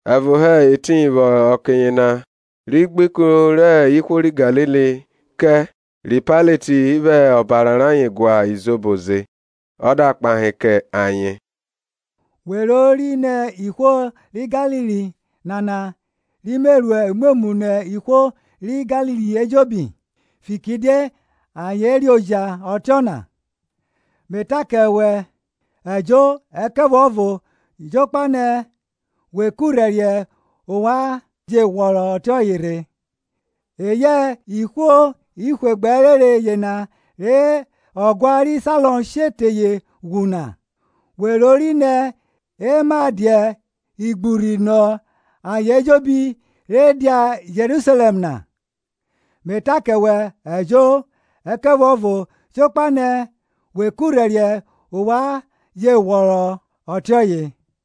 Evo hẹ etiyin vwẹ ọke yena ri gbe ikun rẹ ihwo ri Galili kẹ ri Pailet vwẹ ọbara rayen gua izobo ze. Ọ da kpahe kẹ ayen, We rori nẹ ihwo ri Galili nana ri me ru imwemwu nọ ihwo ri Galili ejobi, fikiridie ayen reoja ọtiọna? Me ta kẹ wẹ, Ẹjo, ẹkẹvuọvo jokpa nẹ we kurhẹriẹ ovwan je ghwọrọ ọtiọye rhe. Eyẹ ihwe gbẹ ẹrenre yena rẹ ọguan ri Sailọm she teye ghwu na, we rori nẹ e ma dia igburhi nọ ayen ejobi re dia Jerusalẹm na? Me ta kẹ wẹ, Ẹjo, ẹkẹvuọvo jokpa nẹ we kurhẹriẹ ovwan je ghwọrọ ọtiọye.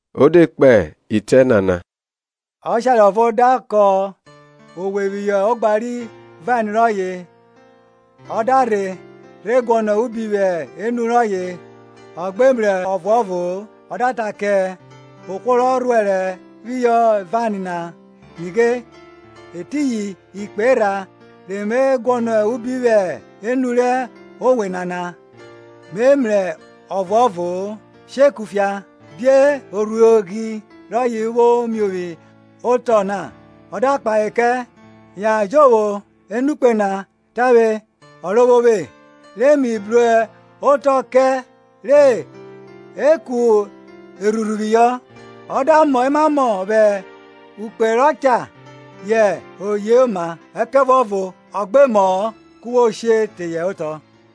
O de kpe itẹ nana. Ọshare ọvo da kọn owe phihọ ogba ri vain rọye; ọ da rhe rhe guọnọ ubi vwẹ enu rọye ọ gbe mrẹ ọvuọvo-o. Ọ da ta kẹ ohwo rọ rhuẹrẹ phihọ vain na, Nighe, Etiyin ikpe erha re Me guọnọ uhi vwẹ enu rẹ owe nana, mẹ mrẹ ọvuọvo-o. She kufia; die orhuoghi rọye vwo m iovwi otọ na? Ọ da kpahe kẹ, Yan jovwo enukpe na tavwe, ọrovwovwe, re mi bru otọ kẹ re e ku erhurhu phihọ. Ọ da mọ emamọ vwẹ ukpe rọ cha yẹ o yoma; ẹkẹvuọvo ọ gbe mọ-ọ, ku wo se she teye otọ.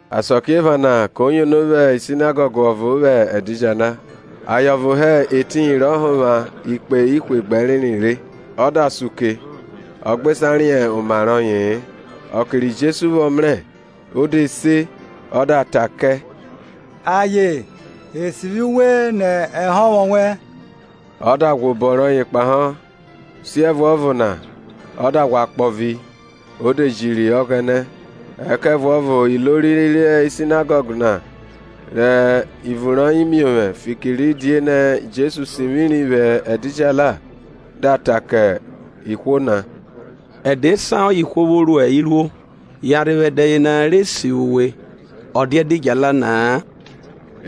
Asakiephana ko yono vwẹ sinagọg ọvo vwẹ ẹdidjala. Aye ọvo hẹ Etiyin rọ honvwa ikpe ihwe gbẹ ẹrenre re; o de sa uke ọ gbe sa riẹn oma rọye-e. Ọke ri Jesu vwọ mrẹ, o de se ọ da ta kẹ, Aye, e sivwi uwe nẹ ehonvwo wẹn. Ọ da ghwẹ obọ kpahọ, siẹvuọvo na ọ da ghwa kpovi, o de jiri Ọghẹnẹ. Ẹkẹvuọvo ilori ri Sinagọg na, rẹ ivun miovwẹ fikiridie Jesu sivwiri vwẹ ẹdidjala, da ta kẹ ihwo na, Ẹdẹ esan ọye ihwo vwo ru iruo, yanrhe vwẹ ẹdẹ yena re e sivwi uwe, ọ dia ẹdidjala na-a.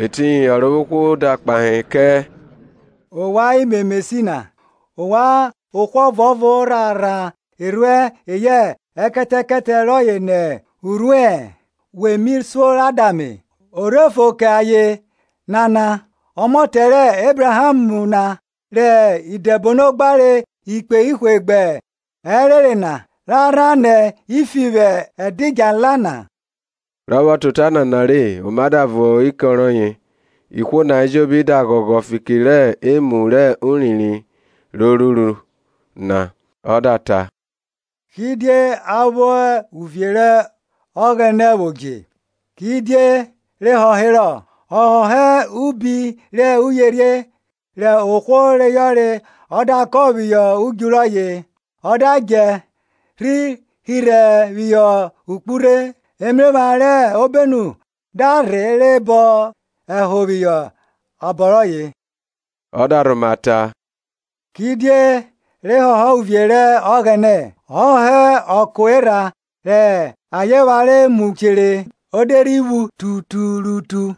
Etiyin Ọrovwohwo da kpahe kẹ, Ovwan imemesi na! Ovwan ohwo ọvuọvo rha rhan erhuẹn eyẹ ekẹtẹkẹtẹ rọye nẹ urhuẹ-ẹn, we mi suo ra da ame? O rhe fo kẹ aye nana, ọmọtẹ rẹ Ebraham na, rẹ Idẹbono gbare ikpe ihwe gbẹ ẹrenre na, ra rhan nẹ ifi vwẹ ẹdidjala na? Rọ vwọ ta ọnana re oma da vo ukọn rọye, ihwo na ejobi da ghọghọ fiki rẹ emu rẹ urinrin ro ruru na. Ọ da ta, Kidie a vwẹ uvie rẹ Ọghẹnẹ vwo dje? Kidie re họherọ? Ọ họhọ ubi rẹ uyerhie rẹ ohwo reyọre ọ da kọn phihọ udju rọye; ọ da djẹ rhi hirhe phihọ okpurhe, emephran rẹ obenu da rhe bọn ẹho phihọ abọ rọye. Ọ da rhoma ta, Kidie re họhọ uvie rẹ Ọghẹnẹ? Ọ họhọ ọko erha rẹ aye phare mu chere, o de rhi phu tuturutu.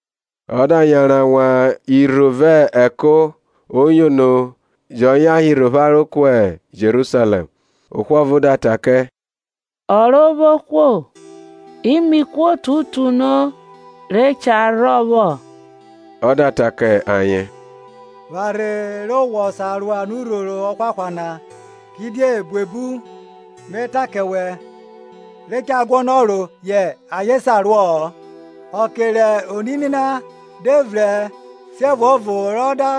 Ọ da yanran wan irho vẹ ẹko, o yono, jọ yan hirhe opharo ku Jerusalẹm. Ohwo ọvo da ta kẹ, Ọrovwohwo, imihwo tutuno re cha rhọ vwọ? Ọ da ta ke ayen, Pharhe re wọ sa ro anurhoro ọhwahwa na; kidie buebu, me ta kẹ wẹ, re cha guọnọ ro yẹ ayen sa ruọ-ọ. Ọke rẹ onini na de vrẹn siẹvuọvo rọ da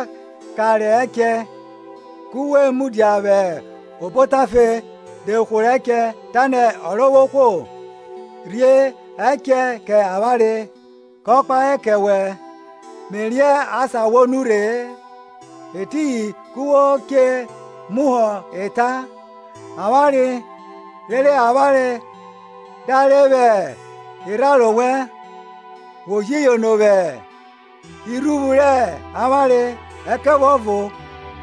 kanre ẹchẹ, ku we mudia vwẹ obo otafe de hworo ẹchẹ, tanẹ, Ọrovwohwo, rhie ẹchẹ kẹ avwanre. Kọ kpahe kẹ wẹ, Me riẹn asan wo nurhe-e. Etiyin ku wo che muhọ ẹta, Avwanre rere avwanre dare vwẹ irharo wẹn, wo ji yono vwẹ irhuvwu rẹ avwanre. Ẹkẹvuọvo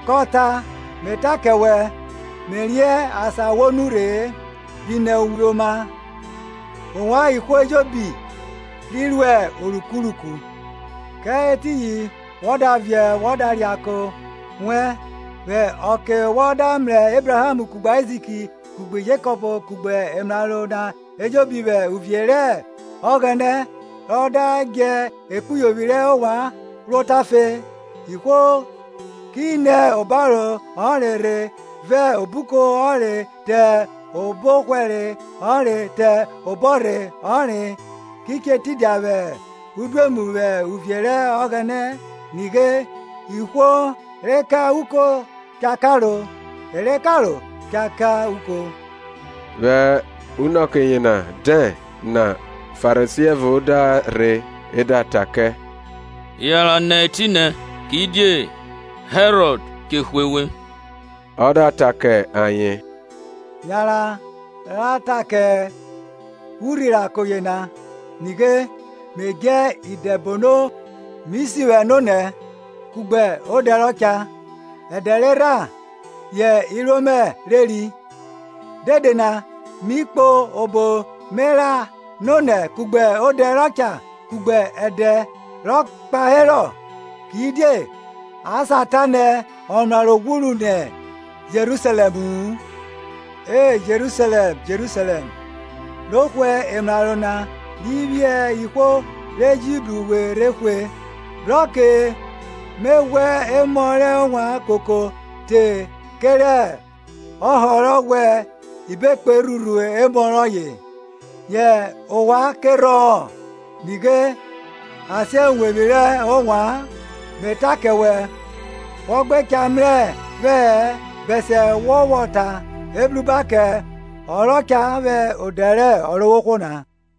ko ta, Me ta kẹ wẹ, Me riẹn asan wo nurhe-e; bi nẹ uvwe oma, ovwan ihwo ejobi ri ruẹ orukuruku. Kẹ etiyin wọ da viẹ wọ da reako wẹn, vwẹ ọke wọ da mrẹ Ebraham kugbe Aizik kugbe Jekọp kugbe emraro na ejobi vwẹ uvie rẹ Ọghẹnẹ ra da djẹ ekpuyovwi rẹ ovwan ro otafe. Ihwo ki nẹ obaro ọnre rhe vẹ obuko ọnre te obọhwẹre ọnre te obọrhe ọnre, ki che tidia vwẹ udoemu vwẹ uvie rẹ Ọghẹnẹ. Nighe, ihwo re ka uko cha karo, e re karo cha ka uko. Vwẹ unọke yena dẹn na Farisi ẹvo da rhe, e da ta kẹ, Yanran nẹ etinẹ, kidie Herọd che hwe we. Ọ da at kẹ ayen, Yanran ra ta kẹ urhirako yena, Nighe, me djẹ idẹbono mi sivwẹ nonẹ kugbe odẹ rọ cha, ẹdẹ rerha yẹ iruo mẹ reri. Dede na mi kpo obo me ra nonẹ kugbe odẹ rọ cha kugbe ẹdẹ rọ kpaherọ; kidie a sa ta nẹ ọmraro ghwu nẹ Jerusalẹmu-u. E Jerusalẹm, Jerusalẹm, ro hwe emraro na ro phiẹ ihwo re ji bru we rhe hwe! Bro ọke me ghwẹ emọ rẹ ovwan koko te kerẹ ọhọ rọ vwẹ ibekpe rhurhu emọ rọye, yẹ ovwan kerhọ-ọn. Nighe, a sen uwevwi rẹ ovwan. Me ta kẹ wẹ, wọ gbe cha mrẹ vwẹ-ẹ bẹsiẹ wọ vwọ ta, Ebruba kẹ ọ rọ cha vwẹ odẹ rẹ Ọrovwohwo na.